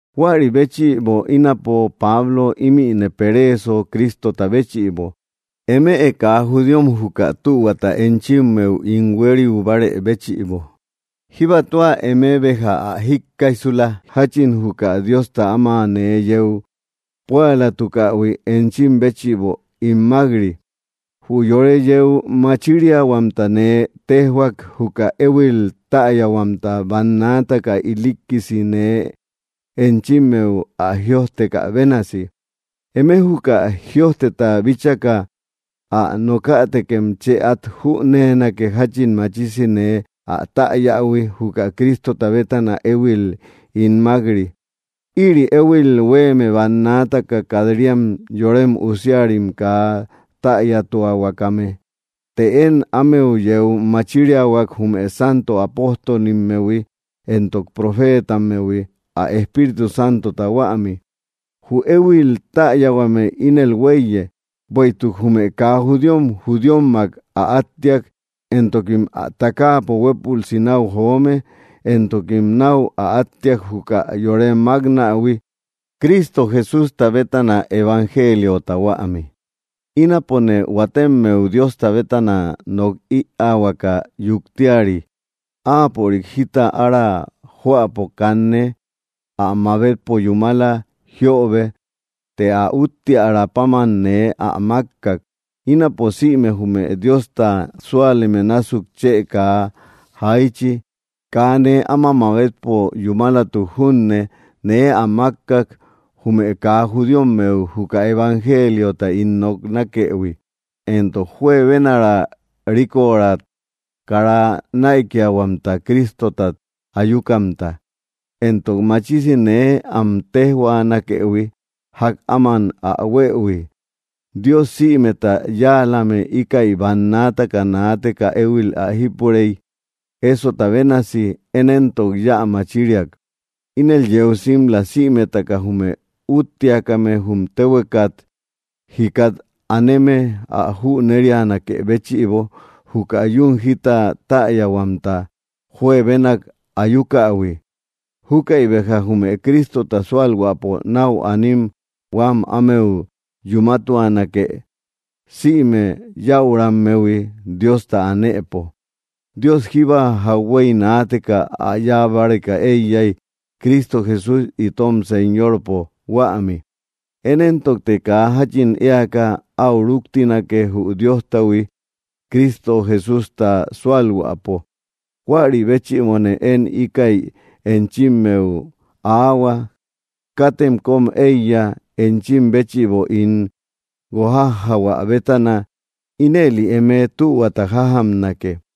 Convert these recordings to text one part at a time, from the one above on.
Huäri béchïbo ínapo Pablo ímïne pereeso Cristota béchïbo, eme kaa judíom juka tühuata enchimmeu ín huériu bárë béchïbo. Jíbatua eme béja ä jíkkaijsula, jáchin juka Diosta áma nee yeu púalatukähui, enchim béchïbo ín mák‑ri. Jü yore yeu machiriahuamta nee téjhuak, juka éhuil täyahuamta, bannaataka ilikkisi nee enchimmeu ä jïojtekä bénasi. Eme juka jïojteta bíchaka ä nokätekem chë át jüneenake, jáchin machisi nee ä täyähui, juka Cristota bétana éhuil ín mák‑ri. Ïri éhuil huéeme bannaataka kat‑riam yorem usiarim kaa täyatuahuakame. Të én ámeu yeu machiriahuak, jume santo apóstolimmehui entok profetammehui, ä Espíritu Santota huämi. Jü éhuil täyahuame ínel huéiye: bueïtuk jume kaa judíom judíommak ä áttiak, entokim ä takaapo huépülsi náu joome, entokim náu ä áttia, juka yore máknähui, Cristo Jesústa bétana, evangeliota huämi. Ínapone huatemmeu Diosta bétana nok ïaahuaka yuktiari. Áapörik jita ára joäpo kanne ä mabetpo yúmala jiöbe; të ä úttiarä páman nee ä mákkak. Ínapo sïme jume Diosta súaleme násuk chë kaa jaichi. Kaa nee áma mabetpo yúmalatuk junne, nee ä mákkak, jume kaa judíommeu juka evangeliota ín noknakëhui, entok juebenaara rícora kara näikiahuamta Cristotat ayukamta. Entok machisi nee am téjhuaanakëhui, ják áman ä huëhui. Dios sïmeta yáalame íkäi bannaataka naateka éhuil ä jípurey, ésota bénasi; én éntok yä machiriak. Ínel yeu simla, sïmetaka jume úttiakame jum téhuekat jikat aneme ä jünerianakë béchïbo, juka yún jita täyahuamta juebenak ayukähui. Júkäi béja jume Cristota sualhuäpo nau anim huam ámeu yúmatuanake, sïme yäurammehui Diosta anëpo. Dios jíba jauhuey naateka ä yáa báreka éiyay, Cristo Jesús itom Señorpo huämi. Én éntokte kaa jáchin éaka áu rúktinake, jü Diostahui, Cristo Jesústa súalhuäpo. Huäri béchïbone én íkäi enchimmeu aahua: katem kóm éiya, enchim béchïbo ín guojajjahuä bétana. Ínëli eme tühuata jajamnake.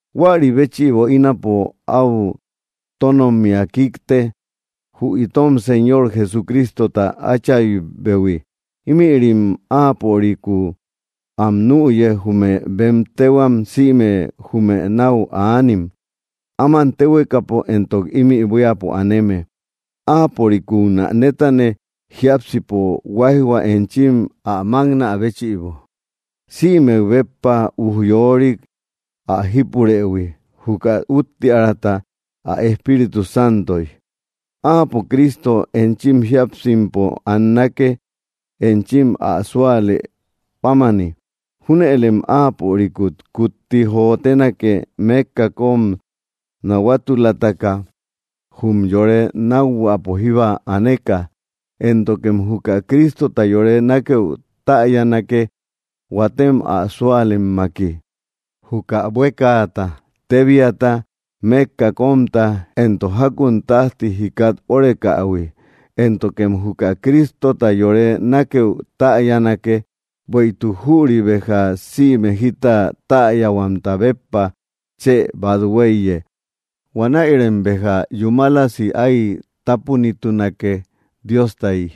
Huäri béchïbo ínapo áu tónommia kíkte, jü itom Señor Jesucristota Áchaybehui. Ímïrim áapörikúu am nüye, jume bem téhuam sïme jume náu aanim, áman téhuekapo entok ímï buíapo aneme. Áaporikúu nä nétane, jiápsipo huáijhua enchim ä máknä béchïbo, sïmek béppa ujyorik ä jípurëhui, juka úttiäraata ä Espíritu Santoy. Áapo Cristo enchim jíapsimpo annake, enchim ä súalë pámani. Júnëlem Áapörikut kutti jotenake, mékka kóm nahuatulataka jum yore nákhuäpo jíba aneka. Éntokem juka Cristota yore nákëu täyanake, huatem ä súalemmaki, juka buékaata, tébiaata, mékka kómik, entok jákun tájti jikat órekähui. Éntokem juka Cristota yore nákeü täyanake, bueïtuk jüri béja sïme jita täyahuamta béppa chë bat huéiye. Huanäirem béja yúmalasi áy tápunitunake, Diostayi.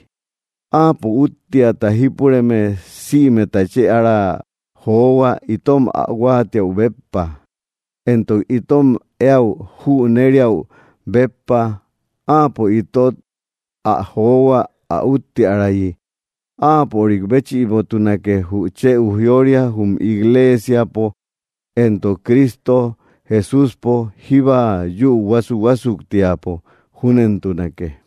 Áapo, úttiata jípureme sïmeta chë ára johua itom ä huáatiau béppa, entok itom eäu jüneriäu béppa. Áapo itot ä johua, ä úttiärayi. ¡Áapörik béchïbotunake jü chë ujyória jum igleesiapo entok Cristo Jesúspo jíba yúu huasuhuasuktiapo! Júnentunake.